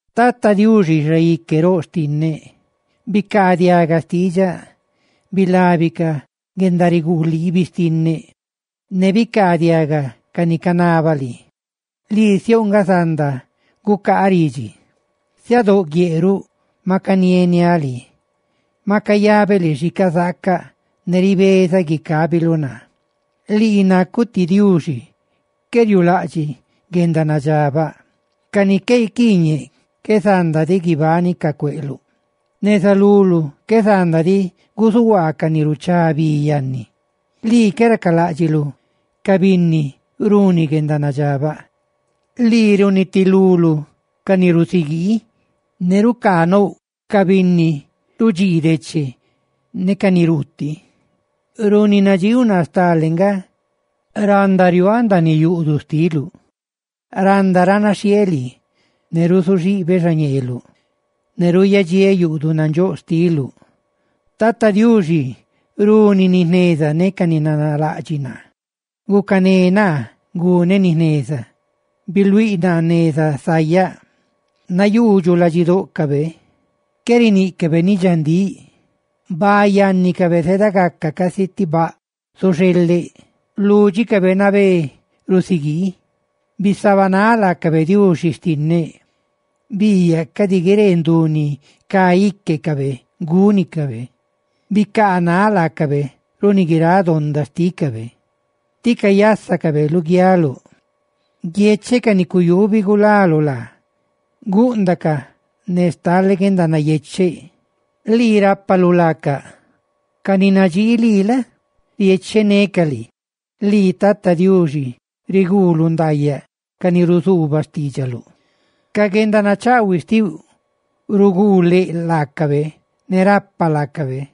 Tata Diuxi, Xaique roꞌ xtinneꞌ, bicaadiaga xtiidxaꞌ, bilabi ca guendariguliibi xtinneꞌ, ne bicaadiaga ca ni canabaꞌ lii, lii siouꞌ nga zanda gucaaꞌ ridxi. Siadóꞌ guieꞌ ruꞌ maꞌ canieniáꞌ lii, ne maꞌ cayabeꞌ lii xi cazaacaꞌ, ne ribezaꞌ guicabiluꞌ naa. Lii nacuꞌ ti Diuxi qué riuulaꞌdxiꞌ guendanadxabaꞌ, ca ni qué iquiiñeꞌ qué zandadiꞌ guibánicaꞌ cueꞌluꞌ, neza luluꞌ qué zanda diꞌ guzuhuaa ca ni ruchá bi yanni. Lii qué racalaꞌdxiꞌluꞌ ca binni runi guendanadxabaꞌ, lii runitiluluꞌ ca ni rusiguii, ne rucaanouꞌ ca binni rudxii deche ne ca ni ruutiꞌ, runi nadxiiuꞌ naa stale nga, randa riuaaꞌ ndaaniꞌ yuꞌduꞌ xtiluꞌ; ¡randa ranaxhieeꞌ lii ne ruzuxibeꞌ xa ñeeluꞌ, ne ruuyadxiéꞌ yuꞌduꞌ nandxóꞌ xtiluꞌ! Tata Diuxi, runi ca ni nanalaꞌdxiꞌ naa, gucané naa guneꞌ ni jneza; biluíꞌ naa neza sayaꞌ. ¡Nayuudxuꞌ ladxidóꞌcabe! Qué riníꞌcabe ni dxandíꞌ, baꞌ yannicabe zedagaca casi ti baꞌ zuxeleꞌ, ¡lúdxicabe nabé rusiguii! ¡Bisabanáꞌ laacabe, Diuxi xtinneꞌ! ¡Biiyaꞌ cadi guiree ndu ni cá íquecabe gúnicabe! Bicaanáꞌ laacabe runi guiráꞌ donda xtícabe, tí cayásacabe luguialuꞌ. Guiecheꞌ ca ni cuyubi gulalu laacaꞌ; gúꞌndacaꞌ ne stale guendanayecheꞌ, lii rápaluꞌ laacaꞌ; ca ni nadxii lii la? riechenecaꞌ lii. Lii Tata Diuxi, riguuluꞌ ndaayaꞌ ca ni ruzuuba xtiidxaluꞌ; guendanachaꞌhuiꞌ xtiuꞌ riguu leꞌ laacabe ne rapa laacabe.